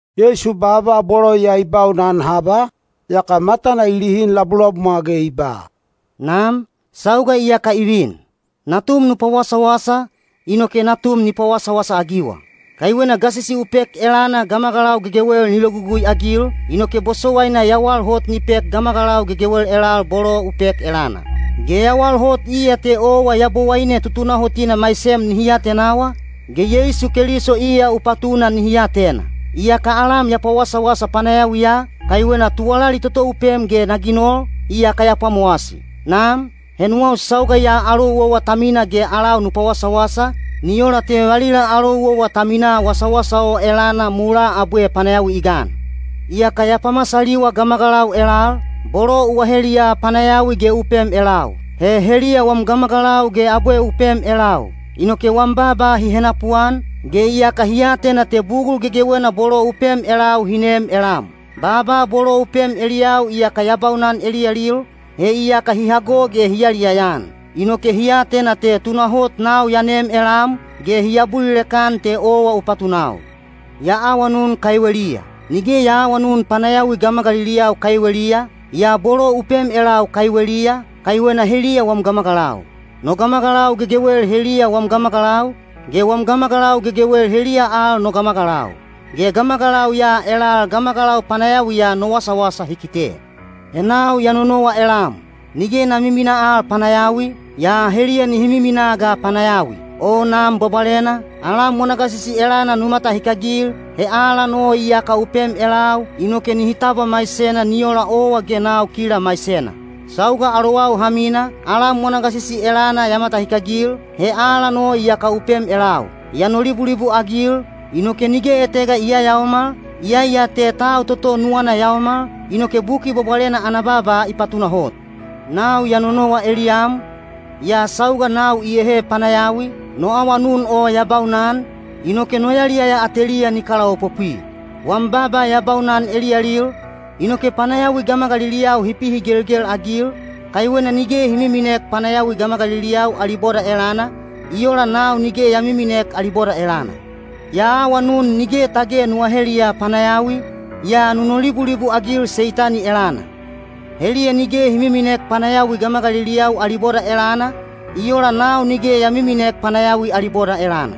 Yeisu baaba bolo ya i baunan haba, yaka matana i lihin labulabumwa ge i ba, “Nam, sauga iyaka i vin. Natum nu pawasawasa, inoke Natum ni pawasawasa-agiwa. Kaiwena gasisi u pek elana gamagalau gegewel ni logugui-agil, inoke bosowaina yawal hot ni pek gamagalau gegewel elal bolo u pek elana. Ge yawal hot iya te owa Yabowaine tutunahotina maisem nihi atenawa, ge Yeisu Keliso iya u patuna nihi atena. Iyaka alam ya pawasawasa panayawiya, kaiwena tuwalali toto u pem ge na ginol, iyaka ya pwamowasi. Nam, he nuwau sauga ya alou owa ta mina ge alau nu pawasawasa, ni ola te valila alou owa ta minaa wasawasa o elana mulaa abwe panayawi i gan. Iyaka ya pamasaliwa gamagalau elal, bolo u aheliya panayawi ge u pem elau. He heliya wam gamagalau ge abwe u pem elau. Inoke wam baaba hi henapuan, ge iyaka hi atena te bugul gegewena bolo u pem elau hi neem elam. Baaba bolo u pem eliyau iyaka ya baunan eliyalil, he iyaka hi hago ge hi yaliyaya-an. Inoke hi atena te tunahot nau ya neem elam, ge hi abulilek-an te owa u patunau. Ya awanun kaiweliya. Nige ya aawanun panayawi gamagaliliyau kaiweliya, yaa bolo u pem elau kaiweliya, kaiwena heliya wam gamagalau. No gamagalau gegewel heliya wam gamagalau, ge wam gamagalau gegewel heliya al no gamagalau. Ge gamagalau ya elal gamagalau panayawiya no wasawasa hi kite. He nau ya nonowa elam. Nige na miminaa al panayawi, yaa heliya nihi miminaa ga panayawi. O Nam Bwabwalena, alam wana gasisi elana nu matahikagil—he alan o iyaka u pem elau—inoke nihi tabwa maisena ni ola owa ge nau kila maisena. Sauga alowau ha mina, alam wana gasisi elana ya matahikagil, he alan o iyaka u pem elau. Ya nolibulibu-agil, inoke nige etega i yayaomal, iyai ya te tau toto nuwana yaomal, inoke Buki Bwabwalena ana baaba i patunahot. Nau ya nonowa eliyam, yaa sauga nau iyehe panayawi, no awanun o ya baunan, inoke no yaliyaya ateliya ni kalaopopwi. Wam baaba ya baunan eliyalil, inoke panayawi gamagaliliyau hi pihigelgel-agil, kaiwena nige hi miminek panayawi gamagaliliyau ali boda elana, i ola nau nige ya miminek ali boda elana. Ya awanun nige tage nu aheliya panayawi, yaa nu nolibulibu-agil Seitani elana. Heliya nige hi miminek panayawi gamagaliliyau ali boda elana, i ola nau nige ya miminek panayawi ali boda elana.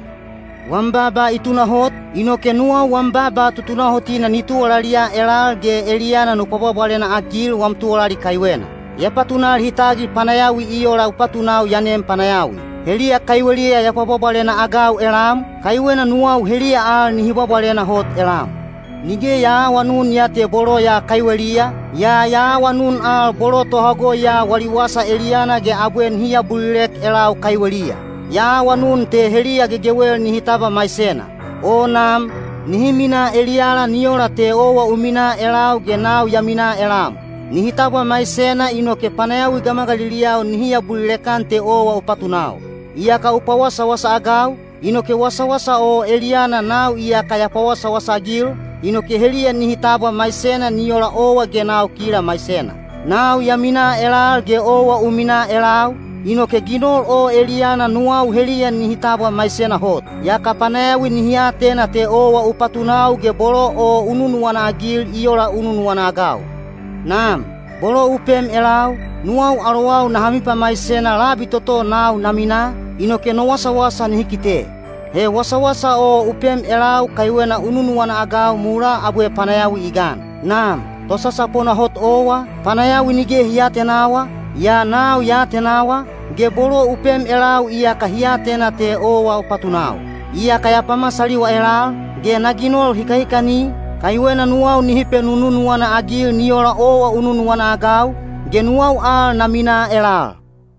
Wam baaba i tunahot, inoke nuwau wam baaba tutunahotina ni tuwalaliya elal ge eliyana nu pwabwabwalena-agil wam tuwalali kaiwena. Ya patunal hi tagil panayawi i ola u patunau ya nem panayawi. Heliya kaiweliya ya pwabwabwalena-agau elam, kaiwena nuwau heliya al nihi bwabwalena hot elam. Nige ya aawanun ya te bolo ya kaiweliya, yaa ya awanun al bolo tohago ya wali wasa eliyana ge abwe nihi abulilek elau kaiweliya. Ya awanun te heliya gegewel nihi tabwa maisena. O Nam, nihi minaa eliyala ni ola te owa u minaa elau ge nau ya minaa elam. Nihi tabwa maisena inoke panayawi gamagaliliyau nihi abulilek-an te owa u patunau. Iyaka u pawasawasa-agau, inoke wasawasa o eliyana nau iyaka ya pawasawasa-agil, inoke heliya nihi tabwa maisena ni ola owa ge nau kila maisena. Nau ya minaa elal ge owa u minaa elau, inoke ginol o eliyana nuwau heliya nihi tabwa maisena hot. Yaka panayawi nihi atena te owa u patunau ge bolo o u nunuwana-agil i ola u nunuwana-agau. Nam, bolo u pem elau, nuwau alowau naha mipamaisena labi toto nau na minaa, inoke no wasawasa nihi kite. He wasawasa o u pem elau kaiwena u nunuwana-agau mulaa abwe panayawi i gan. Nam, Tosasapona hot owa, panayawi nige hi aatenawa, yaa nau ya atenawa, ge bolo u pem elau iyaka hi atena te owa u patunau. Iyaka ya pamasaliwa elal, ge na ginol hikahikani, kaiwena nuwau nihi penununuwana-agil ni ola owa u nunuwana-agau, ge nuwau al na minaa elal.”